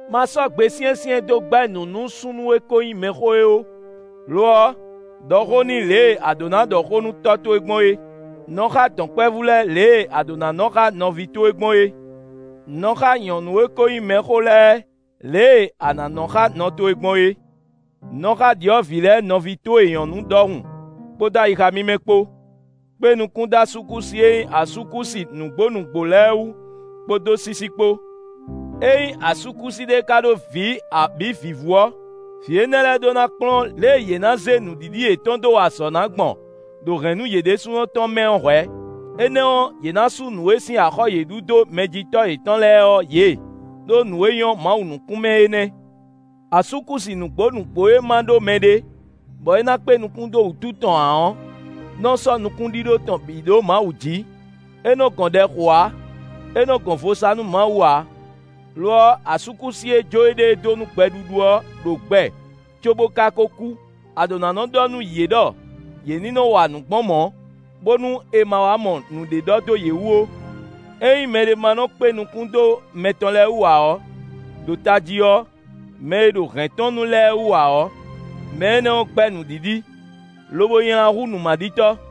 Ma sɔ́ gbe syɛ́nsyɛ́n dó gbɛ́ nǔ nú súnnu e ko nyí mɛxó é ó; lo ɔ́, ɖɔ xó n'i lě e a ɖǒ ná ɖɔ xó nú tɔ́ towe gbɔn é. Nɔ xá dɔ̌nkpɛvú lɛ́ɛ lě e a ɖǒ ná nɔ́ xá nɔví towe gbɔn é. Nɔ xá nyɔ̌nu e ko nyí mɛxó lɛ́ɛ lě e a nǎ nɔ xá nɔ towe gbɔn é. Nɔ xá ɖyɔ̌vǐ lɛ́ɛ nɔví towe nyɔ̌nu ɖɔhun kpódó ayixa mímɛ́ kpó. Kpé nukún dó asúkúsi e nyí asúkúsi nǔgbó nǔgbó lɛ́ɛ wú kpódó sísí kpó. Ényí asúkúsi ɖé ka ɖó vǐ abǐ vǐvú ɔ́, vǐ énɛ́ lɛ́ɛ ɖó ná kplɔ́n lě e yě nǎ zé nǔɖiɖi yětɔn dó wa azɔ̌ ná gbɔn ɖo hɛ̌nnu yě ɖésúnɔ tɔn mɛ ɔ́ hwɛ̌, énɛ́ ɔ́, yě ná sú nǔ e sín axɔ́ yě ɖu dó mɛjitɔ́ yětɔn lɛ́ɛ ɔ́ yě, ɖó nǔ e nyɔ́ Mawu nukún mɛ é nɛ́. Asúkúsi nǔgbó nǔgbó e ma ɖó mɛɖé bɔ é ná kpé nukún dó wútu tɔn ǎ ɔ́ nɔ sɔ́ nukúnɖíɖó tɔn bǐ ɖó Mawu jí. É nɔ gɔn ɖɛ xo ǎ, é nɔ gɔn vo sa nú Mawu ǎ. Lo ɔ́, asúkúsi e jó éɖée dó nú gbɛɖuɖu ɔ́ ɖo gbɛ cóbó ká kó kú. A ɖǒ ná nɔ ɖɔ nú yě ɖɔ yě ní nɔ wa nǔ gbɔn mɔ̌, bónú è ma wá mɔ nǔɖé ɖɔ dó yě wú ó. Ényí mɛɖé ma nɔ kpé nukún dó mɛ tɔn lɛ́ɛ wú ǎ ɔ́, ɖo tají ɔ́, mɛ e ɖo hɛ̌n tɔn nu lɛ́ɛ wú ǎ ɔ́, mɛ énɛ́ ɔ́ gbɛ́ nǔɖiɖi, lobo nylá hú nǔmaɖitɔ́.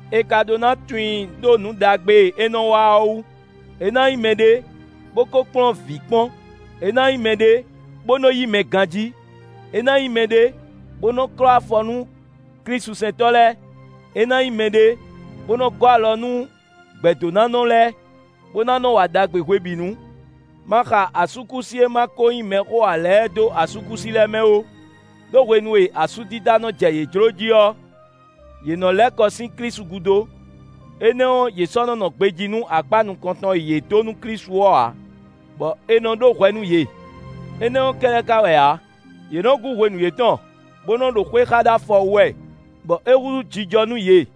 È ka ɖó ná tunwun i ɖó nǔ ɖagbe e é nɔ wa ɔ́ wú; é ná nyí mɛɖé, bó ko kplɔ́n vǐ kpɔ́n, é ná nyí mɛɖé, bó nɔ yí mɛ ganjí; é ná nyí mɛɖé, bó nɔ klɔ́ afɔ nú klísusɛntɔ́ lɛ́ɛ; é ná nyí mɛɖé, bó nɔ gɔ́ alɔ nú gbɛ̌dónánɔ lɛ́ɛ, bó ná nɔ wa ɖagbe hwebǐnu. Ma xa asúkúsi e ma ko nyí mɛxó ǎ lɛ́ɛ dó asúkúsi lɛ́ɛ mɛ ó; ɖó hwenu e asúdida nɔ jɛ yě jló jí ɔ́, yě nɔ lɛ́ kɔ sín Klísu gúdo. Énɛ́ ɔ́, yě sɔ́ nɔ nɔ gbejí nú akpá nukɔn tɔn e yě dó nú Klísu ɔ́ ǎ, bɔ è nɔ ɖó hwɛ nú yě. Énɛ́ ɔ́ kɛ́ɖɛ́ ka wɛ ǎ; yě nɔ́ gú hwenu yětɔn, bó nɔ ɖo xwé xá ɖó afɔ wú wɛ, bɔ é húzú jijɔ nú yě.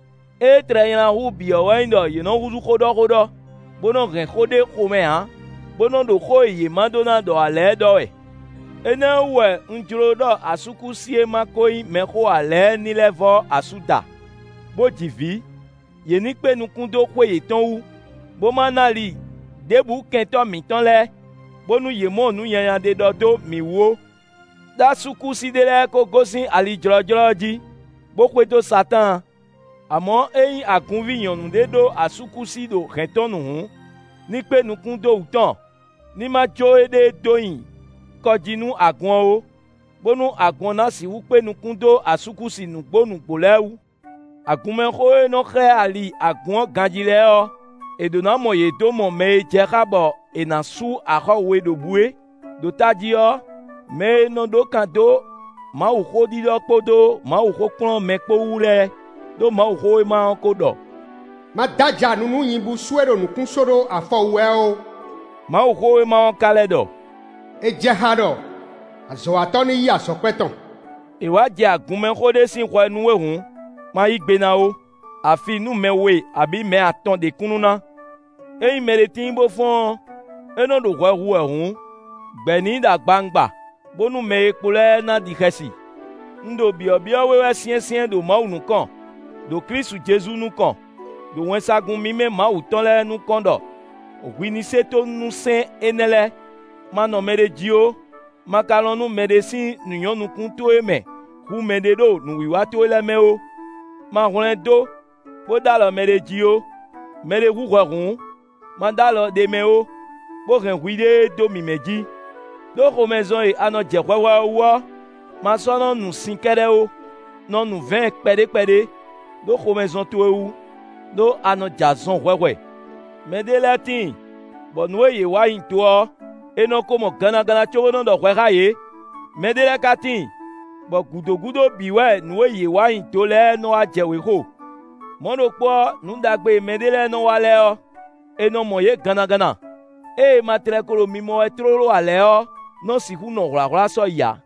Ée tlɛ nylá hú bǐ ɔ́ wɛ nyí ɖɔ yě nɔ húzú xóɖɔ́xóɖɔ́, bó nɔ hɛn xó ɖé xomɛ ǎ, bó nɔ ɖo xó e yě ma ɖó ná ɖɔ ǎ lɛ́ɛ ɖɔ wɛ. Énɛ́ ɔ́ wú wɛ un jló ɖɔ asúkúsi e ma ko nyí mɛxó ǎ lɛ́ɛ ní lɛ́ vɔ́ asú da, bó ji vǐ; yě ní kpé nukún dó xwé yětɔn wú, bó ma ná ali ɖěbǔ kɛntɔ́ mǐtɔn lɛ́ɛ, bónú yě mɔ nǔ nyanya ɖé ɖɔ dó mǐ wú ó. Đó asúkúsi ɖé lɛ́ɛ kó gosín ali jlɔ́jlɔ́ ɔ́ jí, bó xwedó Satáan. Amɔ̌ ényí agunví nyɔ̌nu ɖé ɖó asúkúsi ɖo hɛ̌n tɔn nu hǔn, ní kpé nukún dó wú tɔn; ní ma jó é dó nyi kɔ jí nú agun ɔ́ ó; bónú agun ɔ́ na sixú kpé nukún dó asúkúsi nǔgbó nǔgbó lɛ́ɛ wú. Agunmɛxó e nɔ xlɛ́ ali agun ɔ́ ganjí lɛ́ɛ ɔ́, è ɖó ná mɔ yě dó mɔ mɛ e jɛ xá bɔ è nǎ sú axɔ́ we ɖo bǔ é; ɖo tají ɔ́, mɛ e nɔ ɖó kan dó Mawuxó ɖiɖɔ kpódó Mawuxó kplɔ́n mɛ kpó wú lɛ́ɛ. Đó Mawuxówéma ɔ́ ko ɖɔ: “Ma dó aja nu nú nyibúsú e ɖo nǔkún só ɖó afɔ wú wɛ ɔ́ ó.” Mawuxówéma ɔ́ ka lɛ́ ɖɔ: “É jɛ xá ɖɔ azɔ̌watɔ́ ní yí azɔ̌kwɛ́ tɔn.” È wǎ jɛ agunmɛxó ɖé sín hwɛ nú we hǔn, ma yí gbe ná ó, afi nú mɛ we abǐ mɛ atɔn ɖe kúnnu ná. Ényí mɛɖé tíin bó fɔ́n ɔ́, é nɔ ɖo hwɛ hu wɛ hǔn, gbɛ̌ n'i ɖo agbawungba, bónú mɛ e kpo lɛ́ɛ ná ɖi xɛsi. Un ɖo byɔ̌byɔ́ we wɛ syɛ́nsyɛ́n ɖo Mawu nukɔn, ɖo Klísu Jezu nukɔn, ɖo wɛnsagun mímɛ́ Mawu tɔn lɛ́ɛ nukɔn ɖɔ hwi ní se tónú nú sɛ́n énɛ́ lɛ́ɛ. Ma nɔ mɛɖé jí ó; ma ka lɔn nú mɛɖé sín nǔ nyɔ́ nukún towe mɛ hú mɛɖé ɖo nǔwiwa towe lɛ́ɛ mɛ ó. Ma hwlɛ́n dó, bó ɖ'alɔ mɛɖé jí ó; mɛɖé hu hwɛ hǔn, ma ɖó alɔ ɖ'é mɛ ó, bó hɛn hwiɖée dó mímɛ́ jí. Đó xomɛzɔn e a nɔ jɛ hwɛhwɛ ɔ́ wú ɔ́, ma sɔ́ nɔ nu sin kɛ́ɖɛ́ ó; nɔ nu vɛ̌ɛn kpɛɖé kpɛɖé, ɖó xomɛzɔn towe wú, ɖó a nɔ jɛ azɔn hwɛhwɛ. Mɛ ɖé lɛ́ɛ tíin, bɔ nǔ e yě wa nyi do ɔ́, è nɔ ko mɔ gannaganna cóbó nɔ ɖɔ hwɛ xá yě; mɛɖé lɛ́ɛ ka tíin, bɔ gǔdo gúdo bǐ wɛ nǔ e yě wa nyí do lɛ́ɛ nɔ wá jɛ wěxo. Mɔ̌ ɖokpó ɔ́, nǔ ɖagbe e mɛɖé lɛ́ɛ nɔ wa lɛ́ɛ ɔ́, è nɔ mɔ yě gannaganna; ée è ma tlɛ ko ɖo mimɔ wɛ tlóló ǎ lɛ́ɛ ɔ́, nɔ sixú nɔ hwlǎhwlá sɔ́yi ǎ.